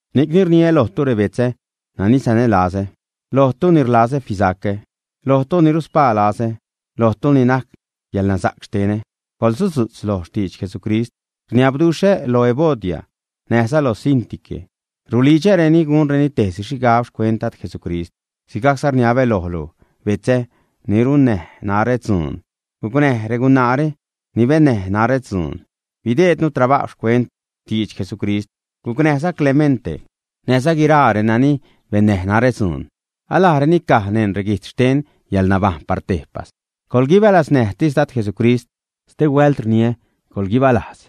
Ni'cni rniä lojtu, rebetzä nani sanälazä, lojtu ni rlazä fisacä, lojtu ni ruspaa lazä, lojtu ni najc yäḻnasa'c xtenä, coḻsudzu'tz loj xtidx Jesucrist. Rniabduxhä lo Evodia näjza lo Síntique, rulidxäreni gunreni tejsi xhigab xcuent Dad Jesucrist. Sigajcza rniabä lojlu betzä, ni runnäj narä dzuun, gucnäj regunaare ni bennäj narä dzuun, bideednu trabajw xcuent xtidx Jesucrist. Gucnäjza Clemente näjza guiraa reni bennäj narä dzuun; alajreni caj neṉ reguijtz xten yäḻnabajṉ par tejpas. Coḻguibalaznäjtis Dad Jesucrist; stehuält rniä: coḻguibalajz.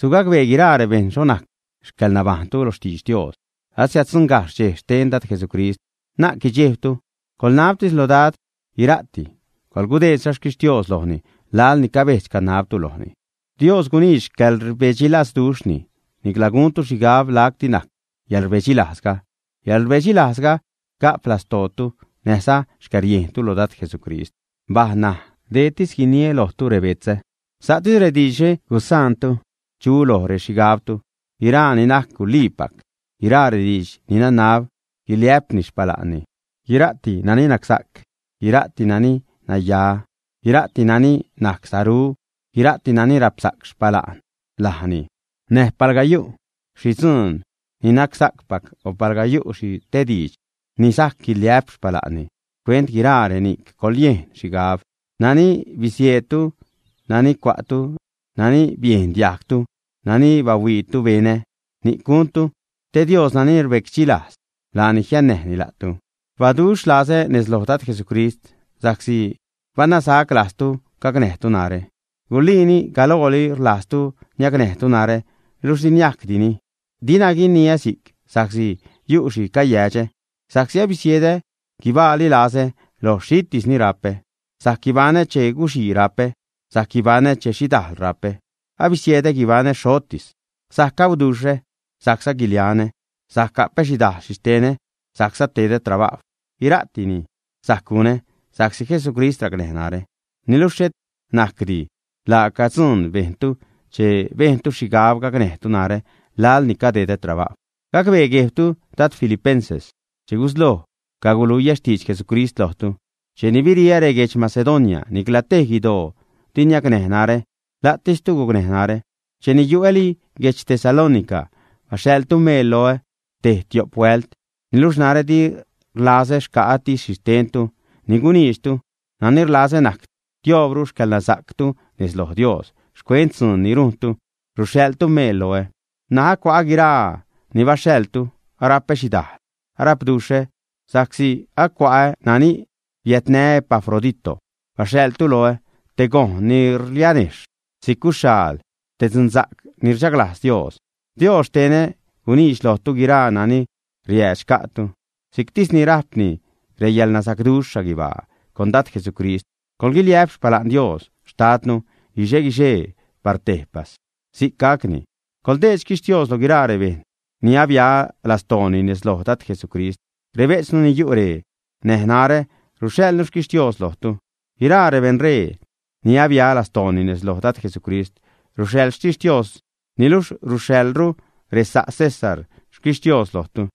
Sugacbee guiraa rebejṉ xho najc xcäḻnabajṉtu lo xtidx Dios. Asiäddzuṉgajxh dxej xten Dad Jesucrist. Na'c guidxejbtu, coḻnabtis lo Dad guira'ti, coḻgudeedza xquixtios lojni laḻ ni cabedx-canabtu lojni. Dios guniidx xcäḻrbedxilazduxhni, nicla guntu xhigab lacti najc yäḻrbedxilajzga. Yäḻrbedxilajzga ga'p lastootu näjza xcäriejntu loj Dad Jesucrist. Mbaj ṉaj, deetis guiniä lojtu rebetzä, sa'tis rediidxre gusaantu chu loj rexhigabtu: guiraa ni najc guliipac; guiraa rediidx ni nanab guiliä'pni xpala'nni, guira'ti nani nacsa'c; guira'ti nani naya; guira'ti nani najc saru; guira'ti nani rapsa'c xpala'n lajni; näj palga yu' xhi dzuun ni nacsa'cpac, o palga yu' xhi te diidx ni sajc guiliä'p xpala'nni, xcuent guiraa reni'c coḻyejn xhigab. Nani bisieedtu, nani cua'tu, nani biejn diajgtu, nani bahuiitu benä, ni'c guntu te Dios ni rbecdxilajz, laani jiannäjni la'tu. Rbaduxh lazä nez loj Dad Jesucrist sa'csi banasac lajztu gacnäjtu narä. Guliini; galooli rlajztu niacnäjtu narä, luxh di niajcdini. Dinä guiniä si'c sa'csi yu' xhi cayädxä, sa'csi abisiedä guibaali lazä loj xhitis ni rapä. Sajc guibaṉä che guxii rapä; sajc guibaṉä che xhidal rapä; abisiedä guibaṉä xhotis: sajc gauduxhä, sajcza guilianä; sajc gapä xhidajl xhixtenä, sajcza tedä trabajw. Guira'tini sajc gunä sa'csi Jesucrist racnäj narä. Niluxh xhet najcdi; laaca dzuun bejntu che bejntu xhigab gacnäjtu narä laḻ ni cadedä trabajw. Gacbee guejbtu, dad filipenses, che gusloj caguluiä xtidx Jesucrist lojtu, cheni biriä reguedx Macedonia, nicla tej guidoo di niacnäj narä, la'tistu gucnäj narä. Cheni yu'äli guedx Tesalónica, baxhaḻtu meel loä tej-tio'p huält. Niluxh narä di rlazä xca'ätis xhixtentu ni guniidxtu, nani rlazä najc tioobru xcäḻnasa'ctu nez lo Dios xcuent dzuun ni rujntu ruxhaḻtu meel loä. N̲aj acua'ä guiraa ni baxhaḻtu, arapä xhidajl, arapduxhä sa'csi acua'ä nani biädnä Epafradito baxhaḻtu loä, te gojṉ ni rlianejxh si'c guxhyaal, te dzunsa'c ni rchaglajz Dios. Dios xtenä guniidx lojtu guiraa nani riäädx xca'tu, si'ctisni rajpni reyäḻnasa'cduxh xhaguibaa con Dad Jesucrist. Coḻguiliä'p xpala'n Dios xtadnu guixe-guixee par tejpas. Si'c gacni. Coḻdeed xtixtios lo guiraa rebejṉ ni abia lastooni nez loj Dad Jesucrist. Rebejtznu ni yu' ree näj narä ruxhaḻnu xtixtios lojtu. Guiraa rebeṉree ni abia lastooni nez loj Dad Jesucrist ruxhaḻ xtixtios, niluxh ruxhaḻru resa' César xtixtios lojtu.